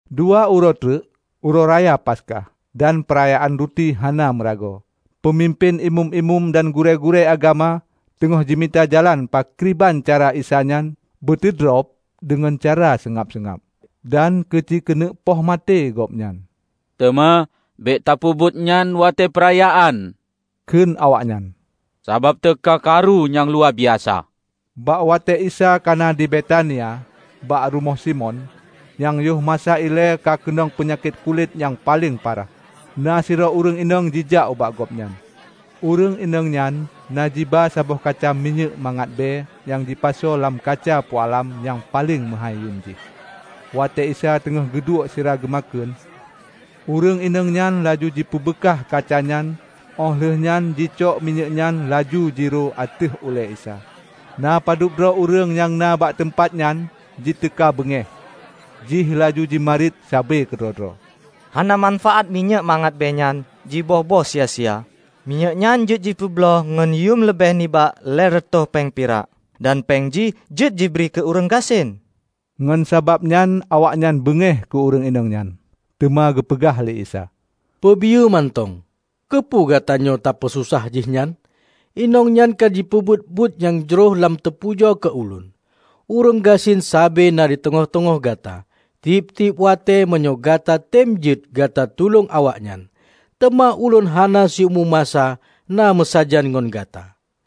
Dua uroe treuk Uroe raya Paskah dan Peurayaan Ruti hana Meuragoe. Peumimpén Imeum-imeum dan gurée-gurée agama teungoh jimita jalan pakriban cara Isa nyan beuteudrob deungon cara seungab-seungab, dan keu jikeuneuk poh maté Gobnyan. "Teuma bék tapeubuet nyan watée peurayaan," kheun awaknyan, "sabab teuka karu nyang luwa biasa." Bak watée Isa kana di Betania, bak rumoh Simon nyang yoh masa ilée ka keunong peunyakét kulét nyang paleng parah, na sidroe ureuëng inong jijak ubak Gobnyan. Ureuëng inong nyan na jiba saboh kaca minyéuk mangat bée nyang jipasoe lam kaca pualam nyang paleng meuhái yuem jih. Watée Isa teungoh geuduek sira geumakheun, ureuëng inong nyan laju jipeubeukah kaca nyan óh lheueh nyan jicok minyéuk nyan laju jiro ateueh ulée Isa. Na padub droe ureuëng nyang na bak teumpat nyan jiteuka beungéh jih laju jimarit sabe keudroe-droe, "Hana manfaát minyéuk mangat bée nyan jiböih-böih sia-sia? Minyéuk nyan jeuet jipeubloe ngon yuem leubeh nibak lhée reutôh péng pirak, dan péng jih jeuet jibri keu ureuëng gasien!" Ngon sabab nyan awaknyan beungéh keu ureuëng inong nyan. Teuma geupeugah lé Isa, "Peubiyeu mantong! Keupeue gatanyoe tapeusosah jihnyan? Inong nyan ka jipeubuet buet nyang jroh lom teupujoe keu Ulôn. Ureuëng gasien sabe na di teungoh-teungoh gata, tieb-tieb watée meunyoe gata tem jeuet gata tulông awaknyan. Teuma ulôn hana siumu masa na meusajan ngon gata.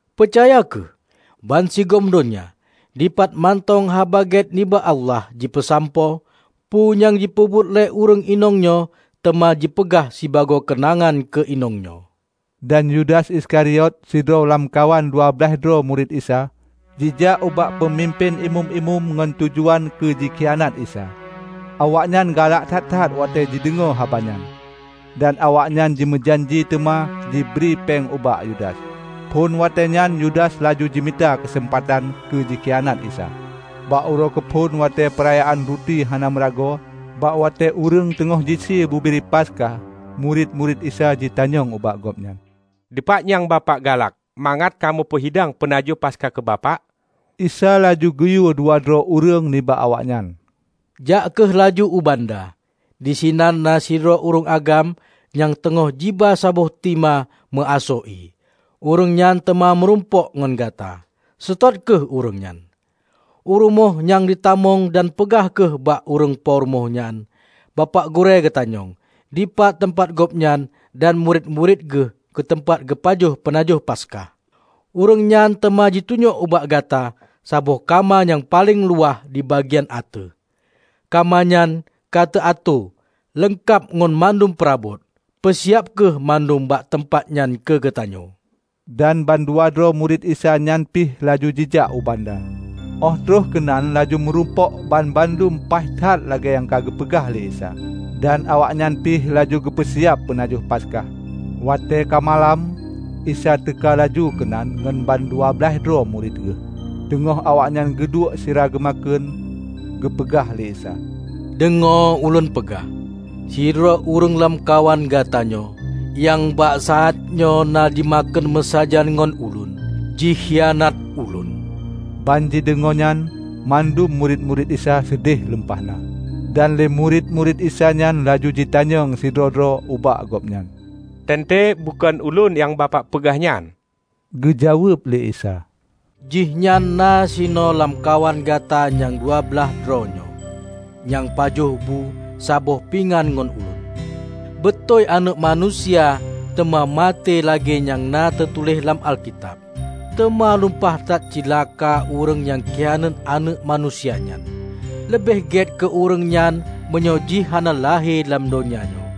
Peucaya kheueh! Ban sigom donya, dipat mantong Haba Gét nibak Allah jipeusampoe, peue nyang jipeubuet lé ureuëng inong nyoe teuma jipeugah sibagoe keunangan keu inong nyoe." Dan Yudas Iskariot, sidroe lamkawan dua blaih droe murit Isa, jijak ubak Peumimpén Imeum-imeum ngon tujuan keu jikhianat Isa. Awaknyan galak that-that watée jideungoe haba nyan, dan awaknyan jimeujanji teuma jibri péng ubak Yudas. Phon watée nyan Yudas laju jimita keuseumpatan keu jikhianat Isa. Bak uroe keuphon watée Peurayaan Ruti Hana Meuragoe -- bak watée ureuëng teungoh jisie bubiri Paskah -- murit-murit Isa jitanyong ubak Gobnyan, "Dipat nyang Bapak galak mangat kamoe peuhidang peunajoh Paskah keu Bapak?" Isa laju geuyue dua droe ureuëng nibak awaknyan, "Jak kheueh laju u banda, disinan na sidroe ureuëng agam nyang teungoh jiba saboh tima meuasoe ié, ureuëng nyan teuma meurumpok ngon gata. Seutôt kheueh ureuëng nyan u rumoh nyang jitamong dan peugah kheueh ubak ureuëng po rumoh nyan, 'Bapak Gurée geutanyong, dipat teumpat Gobnyan dan murit-murit Geuh keu teumpat geupajoh peunajoh Paskah.' Ureuëng nyan teuma jitunyok ubak gata saboh kama nyang paleng luwah dibagian ateueh. Kama nyan ka teuatoe, leungkab ngon mandum peurabot. Peusiab kheueh mandum bak teumpat nyan keu geutanyoe." Dan bandua droe murit Isa nyan pih laju jijak u banda. Óh troh keunan laju meurumpok banmandum paih that lagée nyang ka geupeugah lé Isa. Dan awaknyan pih laju geupeu siab peunajoh Paskah. Watée ka malam, Isa teuka laju keunan ngon bandua blaih droe murit Geuh. Teungoh awaknyan geuduek sira geumakheun, geupeugah lé Isa, "Deungoe ulôn peugah: Sidroe ureuëng lamkawan gata nyoe, nyang bak saát nyoe na jimakheun meusajan ngon Ulôn jikhianat Ulôn." Ban jideungoe nyan, mandum murit-murit Isa seudeh lumpah na. Dan lé murit-murit Isa nyan laju jitanyong sidroe-droe ubak Gobnyan, "Teuntée bukon ulôn nyang Bapak peugah nyan?" Geujaweueb lé Isa, "Jihnyan na sinoe lamkawan gata nyang dua blaih droe nyoe, nyang pajoh bu saboh pingan ngon Ulôn. Beutôi Aneuëk Manusia teuma maté lagée nyang na teutuléh lam Alkitab. Teuma lumpah that cilaka ureuëng nyang khianat Aneuëk Manusia nyan! Leubeh gét keu ureuëng nyan meunyoe jih hana lahé lam donya nyoe!"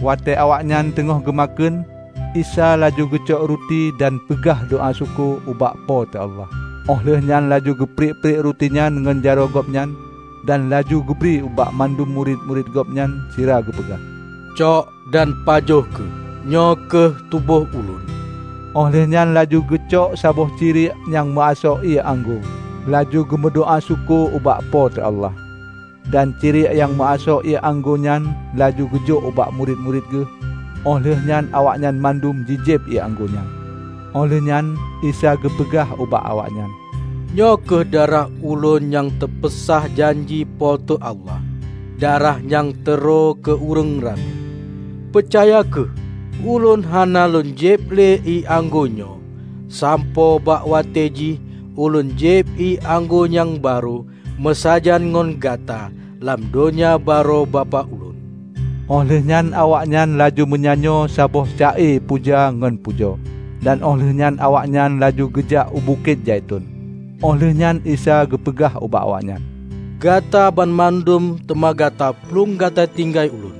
Watée awaknyan teungoh geumakheun, Isa laju geucok ruti dan peugah doá syukoe ubak Po teu Allah. Óh lheueh nyan laju geupriek-priek rutinyan ngon jaroe Gobnyan, dan laju geubri ubak mandum murit-murit Gobnyan sira geupeugah, "Cok dan pajoh kheueh, nyoe kheueh tuboh ulôn." Óh lheueh nyan laju geucok saboh ciriek nyang meuasoe ié anggô. Laju geumeudoá syukoe ubak Po teu Allah, dan ciriek nyang meuasoe ié anggô nyan laju geujok ubak murit-murit Geuh. Óh lheueh nyan awaknyan mandum jijieb ié anggô nyan. Óh lheueh nyan Isa geupeugah ubak awaknyan, "Nyoe kheueh darah ulôn nyang teupeusah janji Po teu Allah, darah nyang teurö keu ureuëng ramé. Peucaya kheueh: Ulôn hana lôn jieb lé ié anggô nyoe, sampoe bak watée jih ulôn jieb ié anggô nyang barô meusajan ngon gata lam Donya Barô Bapak Ulôn." Óh lheueh nyan awaknyan laju meunyanyoe saboh ca-e puja ngon pujoe. Dan Óh lheueh nyan awaknyan laju geujak u Bukét Zaiton. Óh lheueh nyan Isa geupeugah ubak awaknyan, "Gata banmandum teuma gata plueng gata tinggai Ulôn.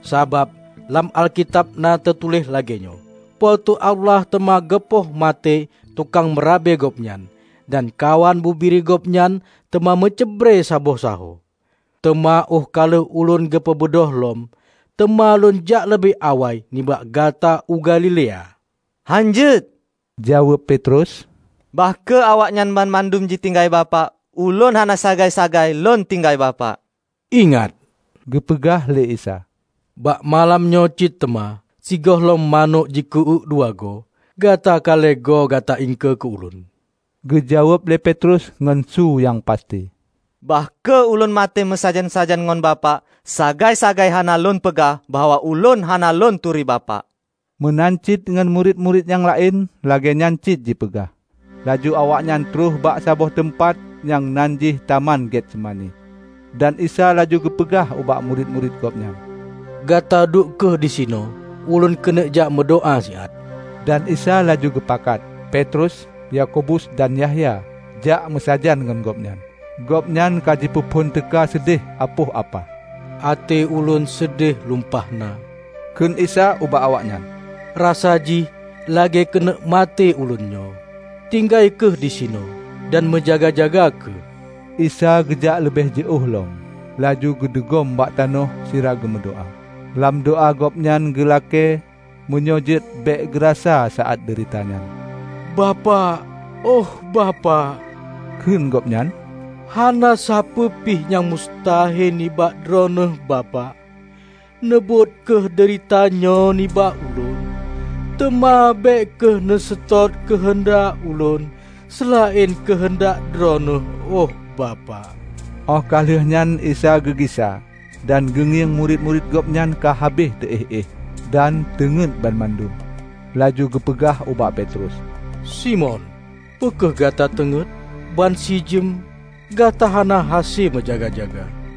Sabab lam Alkitab na teutuléh lagée nyoe, 'Po teu Allah teuma geupoh maté tukang meurabe Gobnyan, dan kawan bubiri Gobnyan teuma meucrebre saboh sahoe.' Teuma óh ka lheueh ulôn geupeubeudôh lom, teuma lôn jak leubeh awai nibak gata u Galilea." "Hán jeuet," jaweueb Petrus, "Bah kheueh awaknyan banmandum jitinggai Bapak, ulôn hana sagai-sagai lôn tinggai Bapak." "Ingat," geupeugah lé Isa, "bak malam nyoe cit teuma, sigohlom manök jiku-uék dua goe, gata ka lhée goe gata iengkeue keu ulôn." Geujaweueb lé Petrus ngon su nyang pasti, "Bah kheueh ulôn maté meusajan-sajan ngon Bapak, sagai-sagai hana lôn peugah bahwa ulôn hana lôn turi Bapak!" Meunan cit ngon murit-murit nyang laén lagée nyan cit jipeugah. Laju awaknyan troh bak saboh teumpat nyang nan jih taman Getsemani, dan Isa laju geupeugah ubak murit-murit Gobnyan, "Gata duek kheueh disinoe ulôn keuneuk jak meudoá siat." Dan Isa laju geupakat Petrus, Yakobus, dan Yahya jak meusajan ngon gobnyan. Gobnyan ka jipeuphon teuka seudeh apoh apah. "Até Ulôn seudeh lumpah na," kheun Isa ubak awaknyan, "Rasa jih lagée keuneuk maté Ulôn nyoe. Tinggai kheueh disinoe dan meujaga-jaga kheueh!" Isa geujak leubeh jiôh lom laju geudugom bak tanoh sira geumeu doá. Lam doá gobnyan geulakée meunyoe jeuet bék geurasa saát deurita nyan. "Bapak, ôh Bapak," kheun Gobnyan, "Hana sapeuepih nyang mustahe nibak Droeneueh Bapak. Neubot kheueh deurita nyoe nibak Ulôn. Teuma bék kheueh neuseutôt keuheundak Ulôn seulaén keuheundak Droeneueh ôh Bapak." Óh ka lheueh nyan Isa geugisa dan geungieng murit-murit Gobnyan ka habéh teuéh-éh dan teungét banmandum. Laju geupeugah ubak Petrus, "Simon, peu kheueh gata teungét? Ban sijeuem, gata hana hase meujaga-jaga?"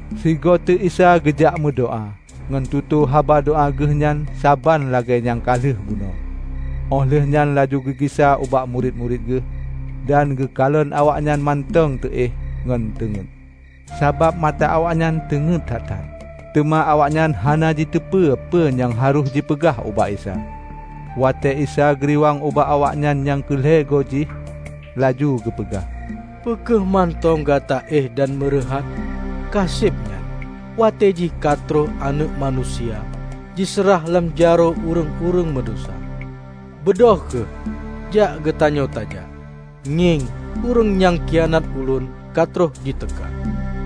Sigoe teuk Isa geujak meudoá ngon tutoe haba doá Geuh nyan saban lagée nyang ka lheueh bunoe. Óh lheueh nyan laju geugisa ubak murit-murit Geuh dan geukalon awaknyan mantong teuéh ngon teungét, sabab mata awaknyan teungét that-that. Teuma awaknyan hana jiteupeu peue nyang harôh jipeugah ubak Isa. Watée Isa geuriwang ubak awaknyan nyang keu lhée goe jih, laju geupeugah, "Peu kheueh mantong gata éh dan meureuhat? Kaseb nyan! Watée jih ka troh Aneuëk Manusia jiseurah lam jaroe ureuëng-ureuëng meudesya. Beudôh kheueh, jak geutanyoe tajak. Ngieng! Ureuëng nyang khianat ulôn ka troh jiteuka!"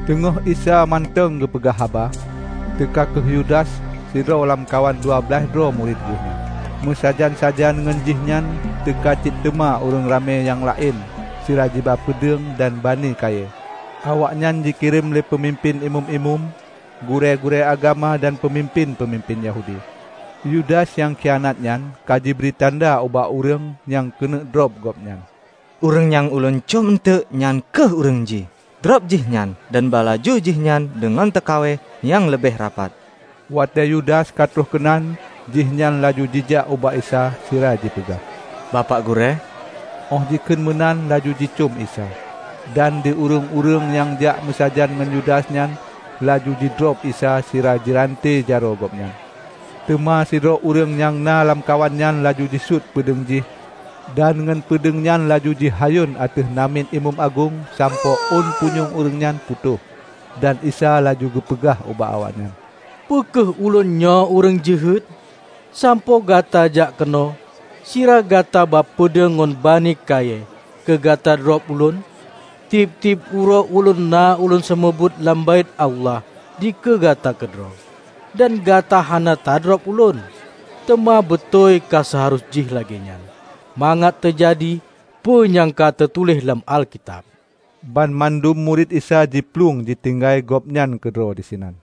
Teungoh Isa mantong geupeugah haba, teuka kheueh Yudas, sidroe lamkawan dua blaih droe murit Geuh nyan. Meusajan-sajan ngon jihnyan teuka cit teuma ureuëng ramé nyang laén sira jiba peudeueng dan banie kayée. Awaknyan jikirém lé peumimpén imeum-imeum, gurée-gurée agama dan peumimpén-peumimpén Yahudi. Yudas nyang khianat nyan ka jibri tanda ubak ureuëng nyang keuneuk drob gobnyan. "Ureuëng nyang ulôn côm eunteuk," nyan kheueh ureuëng jih, "drob Jihnyan dan ba laju Jihnyan deungon teukawai nyang leubeh rapat." Watée Yudas ka troh keunan, jihnyan laju jijak ubak Isa sira jipeugah, "Bapak Gurée!" óh jikheun meunan laju jicôm Isa. Dan di ureuëng-ureuëng nyang jak meusajan ngon Yudas nyan laju jidrob Isa sira jiranté jaroe Gobnyan. Teuma sidroe ureuëng nyang na lamkawan nyan laju jisut peudeueng jih dan ngon peudeueng nyan laju jihayôn ateueh namiet imeum agong sampoe ôn punyueng ureuëng nyan putôh. Dan Isa laju geupeugah ubak awaknyan, "Peu kheueh Ulôn nyoe ureuëng jeuhet, sampoe gata jak keunoe sira gata ba peudeueng ngon banie kayée keu gata drob Ulôn? Tieb-tieb uroe Ulôn na lôn seumeubeuet lam Baét Allah dikeue gata keudroe, dan gata hana tadrob ulôn. Teuma beutôi ka seuharôh jih lagée nyan, mangat teujadi peue nyang ka teutuléh lam Alkitab." Banmandum murit Isa jiplueng jitinggai Gobnyan keudroe disinan.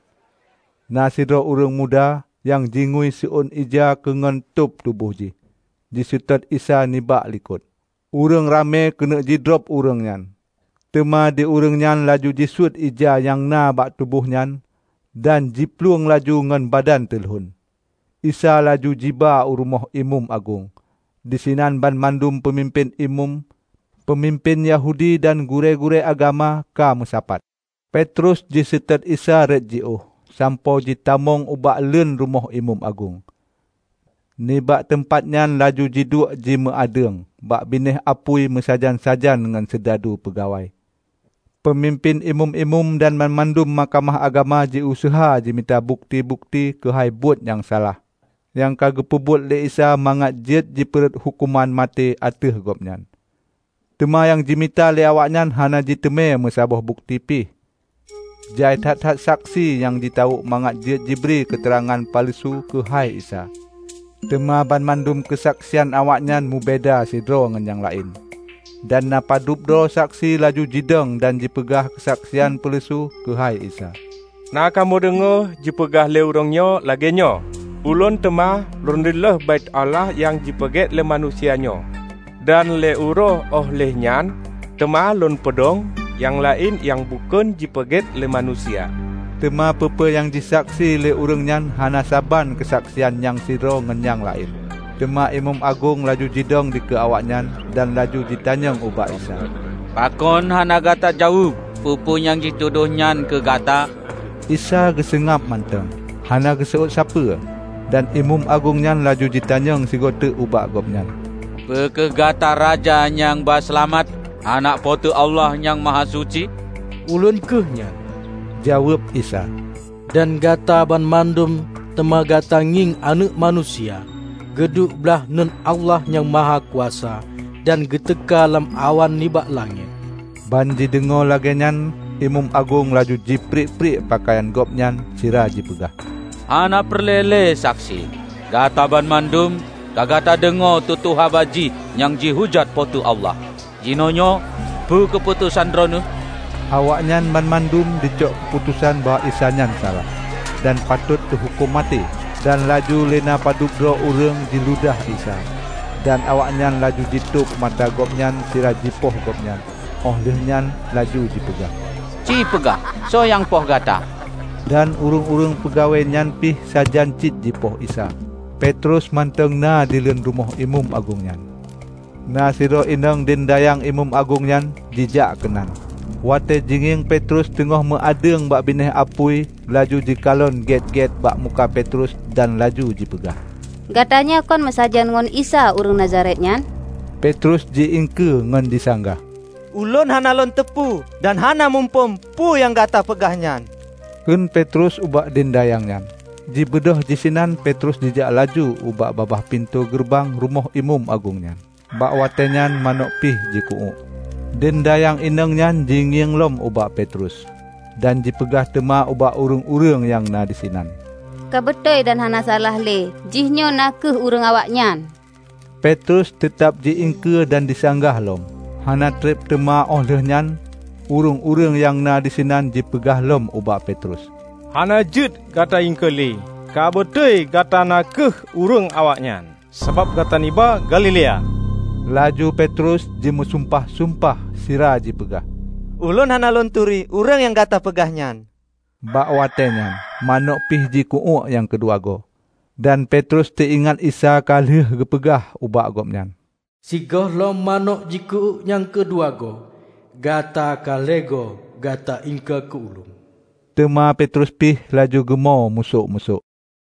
Na sidroe ureuëng muda, nyang jingui siôn ija keungon tob tuboh jih, jiseutôt Isa nibak likot. Ureuëng ramé keuneuk jidrob ureuëng nyan, teuma di ureuëng nyan laju jisuet ija nyang na bak tuboh nyan, dan jiplueng laju ngon badan teulon. Isa laju jiba u rumoh imeum agong. Disinan banmandum peumimpén imeum, peumimpén Yahudi dan gurée-gurée agama ka meusapat. Petrus jiseutôt Isa rot jiôh sampoe jitamong ubak leuen rumoh imeum agong. Nibak teumpat nyan laju jiduek jimeu adeueng bak binéh apui meusajan-sajan ngon sidadu-sidadu peungawai. Peumimpén Imeum-imeum dan banmandum Mahkamah Agama jiuseuha jimita bukeuti-bukeuti keuhai buet nyang salah nyang ka geupeubuet lé Isa mangat jeuet jipeu rhot huköman maté ateueh Gobnyan. Teuma nyang jimita lé awaknyan hana jiteumé meusaboh bukeuti pih. Jai that-that saksi nyang jitawök mangat jeuet jibri keuteurangan peuleusu keuhai Isa, teuma banmandum keusaksian awaknyan meubeda sidroe ngon nyang laén. Dan na padub droe saksi laju jidong dan jipeugah keusaksian peuleusu keuhai Isa, "Na kamoe deungoe jipeugah lé ureuëng nyoe lagée nyoe, 'Ulôn teuma lôn reuloh Baét Allah nyang jipeugét lé manusia nyoe, dan lhée uroe óh lheueh nyan, teuma lôn peudong nyang laén nyang bukon jipeugét lé manusia.' " Teuma peue-peue nyang jisaksi lé ureuëng nyan hana saban keusaksian nyang sidroe ngon nyang laén. Teuma imeum agong laju jidong dikeue awaknyan dan laju jitanyong ubak Isa, "Pakon hana gata jaweueb peue-peue nyang jitudôh nyan keu Gata?" Isa seungab mantong, hana geuseuôt sapeue. Dan imeum agong nyan laju jitanyong sigoe teuk ubak Gobnyan, "Peu kheueh gata Raja nyang ba Seulamat, Aneuëk Po teu Allah Nyang Mahasuci?" "Ulôn kheueh nyan," jaweueb Isa, "dan gata banmandum teuma gata ngieng Aneuëk Manusia geuduek blaih uneuen Allah Nyang Mahakuasa dan geuteuka lam awan nibak langét!" Ban jideungoe lagée nyan imeum agong laju jipriek-priek peukayan gobnyan sira jipeugah, "Hana peureulée lé saksi! Gata banmandum ka gata deungoe tutoe haba jih nyang jihujat Po teu Allah. Jinoenyoe peue keuputosan droeneueh?" Awaknyan banmandum jicok keuputosan bahwa Isa nyan salah, dan patot teuhuköm maté. Dan laju lé na padub droe ureuëng jiludah Isa, dan awaknyan laju jitôb mata Gobnyan sira jipoh gobnyan, óh lheueh nyan laju jipeugah, "Ci peugah, soe nyang poh gata?" Dan ureuëng-ureuëng peungawai nyan pih sajan cit jipoh Isa. Petrus mantong na dileuen rumoh imeum agong nyan, na sidroe inong deundayang imeum agong nyan jijak keunan. Watée jingieng Petrus teungoh meu adeueng bak binéh apui, laju jikalon gét-gét bak muka Petrus dan laju jipeugah, "Gata nyoe kon meusajan ngon Isa ureuëng Nazaret nyan?" Petrus ji-iengkeue ngon jisanggah. "Ulôn hana lôn teupeu dan hana muphom peue nyang gata peugah nyan," kheun Petrus ubak dendayang nyan. Jibeudôh sinan Petrus jijak laju ubak babah pintoe geureubang rumoh imeum agong nyan. Bak watée nyan, manôk pih jiku-uék. Deundayang inong nyan jingieng lom ubak Petrus, dan jipeugah teuma ubak ureuëng-ureuëng nyang na disinan, "Ka beutôi dan hana salah le, jihnyoe na kheueh ureuëng awaknyan!" Petrus teutab ji-iengkeue dan jisanggah lom. Hana treb teuma óh lheueh nyan, ureuëng-ureuëng nyang na disinan jipeugah lom ubak Petrus, "Hana jeuet gata iengkeue lé ka beutôi gata na kheueh ureuëng awaknyan, sabab gata nibak Galilea!" Laju Petrus jimeusumpah-sumpah sira jipeugah, "Ulôn hana lôn turi ureuëng nyang Gata peugah nyan!" Bak watée nyan manôk pih jiku-uék nyang keu dua goe. Dan Petrus teuingat Isa ka lheueh geupeugah ubak gobnyan, "Sigohlom manôk jiku-uék nyang keu dua goe, gata ka lhée goe gata iengkeue keu Ulôn." Teuma Petrus pih laju geumo musök-musök.